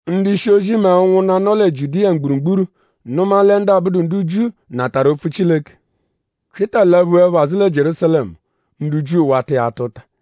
Ndu-ishi-ozi mẹ ụnwunna, nọ lẹ Jiudiya mgburugburu nụma lẹ ndu abụdu ndu Jiu natarụ opfu Chileke. Pyịta laphuẹpho azụ lẹ Jierúsalẹmu; ndu Jiu wata iya ata ụta.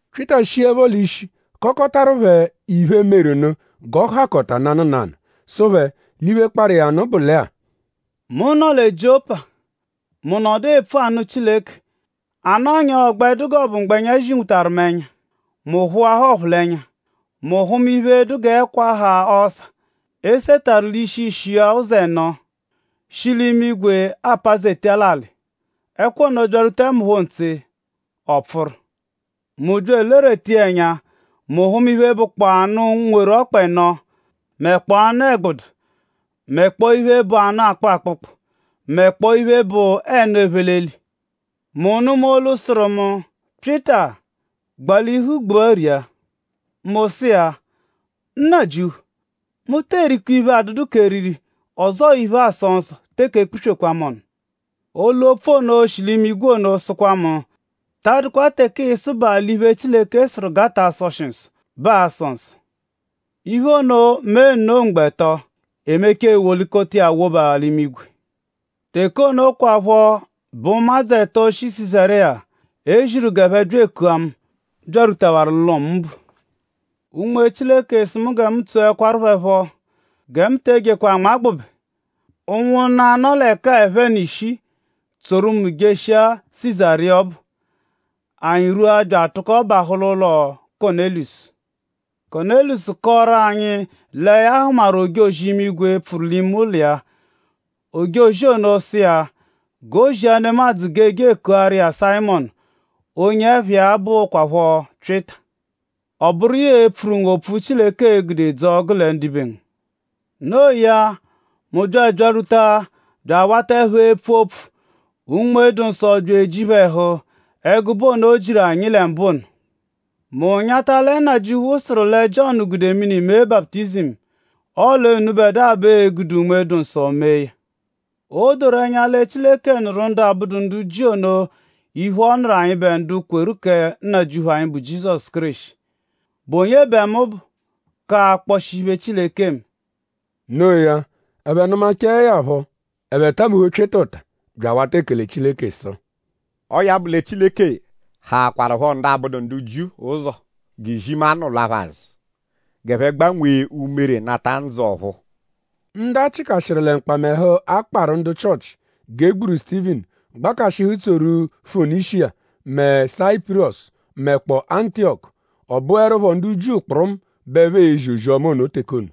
Pyịta shiẹpho l'ishi kọkotaru phẹ iphe, meru nụ g'ọ hakọta nanụ nanụ. Sụ phẹ l'iphe, kparụ iya nụ bụ lẹ-a: “Mu nọ lẹ Jiọpa. Mu nọdu epfu anụ Chileke. A nọnyaa ọ gbẹ dụ g'ọ bụ mgbẹnya zinwutaru mu ẹnya. Mu phụahaa ọphulenya. Mu hụma iphe, dụ g'ẹkwa, ha ọsa, e setarụ l'ishi-ishi iya ụzo ẹno; shi l'imigwe apazeta l'alị. Ẹkwa ono byarwutaẹ mu phọ ntse; ọ pfụru. Mu bya elerweta iya ẹnya. Mu hụma iphe, bụkpoo anụ, nweru ọkpa ẹno mẹkpoo anụ-ẹgbudu; mẹkpoo iphe, bụ anụ, akpụ akpụkpu; mẹkpoo iphe, bụ ẹnu, ephe l'eli. Mu nụma olu, sụru mu: ‘Pyịta; gbalihu gbua ria!’ Mu sụ iya: Nnajịuphu; mu tee rikwa! Iphe, adụdu k'eriri ọzoo iphe, aasọ nsọ teke ekpuswekwaa mu ọnu. Olu-opfu ono, shi l'imigwe ono sụkwa mu: ‘Ta adụkwa teke ịisubaa l'iphe, Chileke sụru g'a ta asọshi nsọ bẹ aasọ nsọ.’ Iphe ono mee nno mgbo ẹto. E mechaa e wolikọta iya woba l'imigwe. Teke ono kwaphọ bẹ ụmadzu ẹto, shi Sizariya, e ziru g'ẹphe bya ekua mu byarwutawaru l'ụlo, mu bu. “Unme Chileke sụ mu gẹ mu tsoẹkwaru phẹ phọ; gẹ mu te ejekwa anmagbụbe. Ụnwunna-a, nọ l'ẹka-a ẹphe n'ishii tsoru mu jeshia Sizariya ọbu. Anyi rwua bya atụko bahụ l'ụlo Kọnelusu. Kọnelusu kọoru anyi lẹ ya hụmaru ojozi-imigwe, pfụru l'ime ụlo iya; ojozi ono sụ iya g'o zia nemadzụ g'e je ekuaru iya Sayịmonu, onye ẹpha iya bụkwapho Pyịta. Ọ bụru iya e-pfuru ngu opfu, Chileke e-gude dzọo gụle ndibe ngu. No iya; mu bya abyarwuta bya awataẹpho epfu opfu; Unme-dụ-Nsọ bya eji phẹ ẹhu ẹgube ono, o jiru anyi lẹ mbụ ono. Mu nyata lẹ Nnajịuphu sụru lẹ Jiọnu gude mini mee baputizimu; ọle unubẹdua bẹ ee-gude Unme-dụ-Nsọ mee ya. O doru ẹnya lẹ Chileke nụru ndu abụdu ndu Jiu ono iphe, ọ nụru anyịbe ndu kweru kẹ Nnajịuphu anyi, bụ Jizọsu Kéreshi.?Bụ onye bẹ mu bụ k'akpọshi iphe, Chileke eme?” Noo ya; ẹphe nụmachae ya phọ; ẹphe tabuhu Pyịta ụta bya awata ekele Chileke sụ: “Ọo ya bụ lẹ Chileke hakwarụpho ndu abụdu ndu Jiu ụzo g'izimanụ lwa phẹ azụ g'ẹphe gbanwee umere nata ndzụ ọ̀phúú.” Ndu a chịkashiru lẹ mkpamẹhu, a kparụ ndu Chịochi g'e gburu Sutivinu gbakashịhu tsoru Fonishiya mẹ Sayipurọsu; mẹkpoo Antiyọku. Ọ bụerupho ndu Jiu kpụrumu bẹ ẹphe ezi ozi-ọma ono teke ono.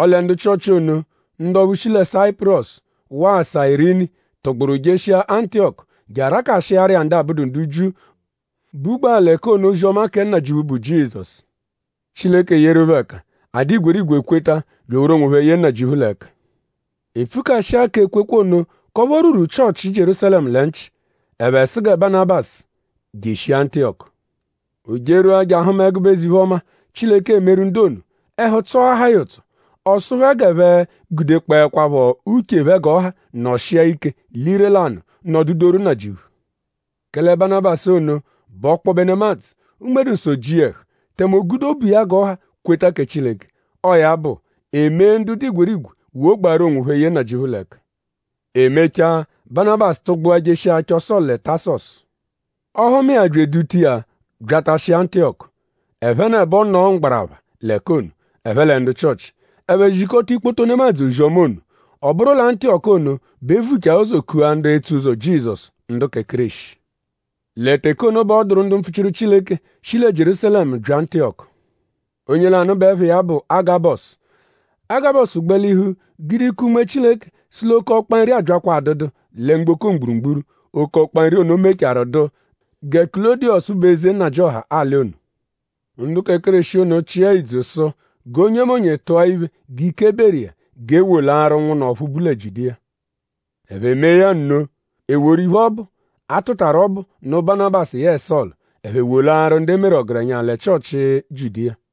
Ọle ndu Chịochi ono; ndu ọphu shi Sayipurọsu waa Sayirini tụgburu jeshia Antiyọku je arakashiaru ndu abụdu ndu Jiu, bugbaa l'ẹka ono ozi-ọma kẹ Nnajịuphu, bụ Jizọsu. Chileke yeru phẹ ẹka; a dụ igwerigwe kweta; bya eworu onwophẹ yee Nnajịuphu l'ẹka. E pfukashịa k'ekwekwe ono k'ọphu o rwuru Chịochi Jierúsalẹmu lẹ nchị. Ẹphe sụ gẹ Banabasu jeshia Antiyọku. O jerwua je ahụma ẹgube eze-iphe-ọma, Chileke emeru ndu ono. Ẹhu tsọahaa ya ụtso. Ọ sụ phẹ g'ẹphe gudekpọekwapho uche phẹ g'ọha nọshia ike l'ire-lanụ nọdudoru Nnajịuphu. Kẹle Banabasu ono bụ ọkpobe nemadzụ; Unme-dụ-Nsọ ji iya ẹhu; tẹme o gude obu iya g'ọ ha kweta kẹ Chileke. Ọo ya bụ; e mee ndu dụ igwerigwe wogbaru onwophẹ yee Nnajịuphu l'ẹka. E mechaa; Banabasu tụgbua jeshia achọ Sọlu lẹ Tasọsu. Ọ hụma iya bya eduta iya byatashia Antiyọku. Ẹphenebo nọo mgbarapha l'ẹka ono; ẹphe lẹ ndu Chịochi. Ẹphe zikọta ikpoto nemadzụ ozi-ọma ono. Ọ bụru lẹ Antiyọku ono bẹ e vuchaa ụzo kua ndu etso ụzo Jizọsu ndu kẹ Kéreshi. Lẹ teke ono bẹ ọ dụru ndu mpfuchiru Chileke, shi lẹ Jierúsalẹmu bya Antiyọku. Onye lanụ bẹ ẹpha iya bụ Agabọsu. Agabọsu gbalihu gude ike Unme Chileke sụ l'oke ọkpa-nri abyakwa adụdu lẹ mgboko mgburugburu. Oke ọkpa-nri ono mechaarụ dụ gẹ Kulọdiyosu bụ eze nnajịoha alị ono. Ndu kẹ Kéreshi ono chịa ìdzù sụ g'onyemonye tụa iphe g'ike beru iya g'e wolaaru ụnwunna ọphu bu lẹ Jiudiya. Ẹphe mee ya nno. E woru iphe ọbu, a tụtaru ọbu nụ Banabasu yẹe Sọlu; ẹphe wolaaru ndu e meru ọgerenya lẹ Chịochi Jiudiya.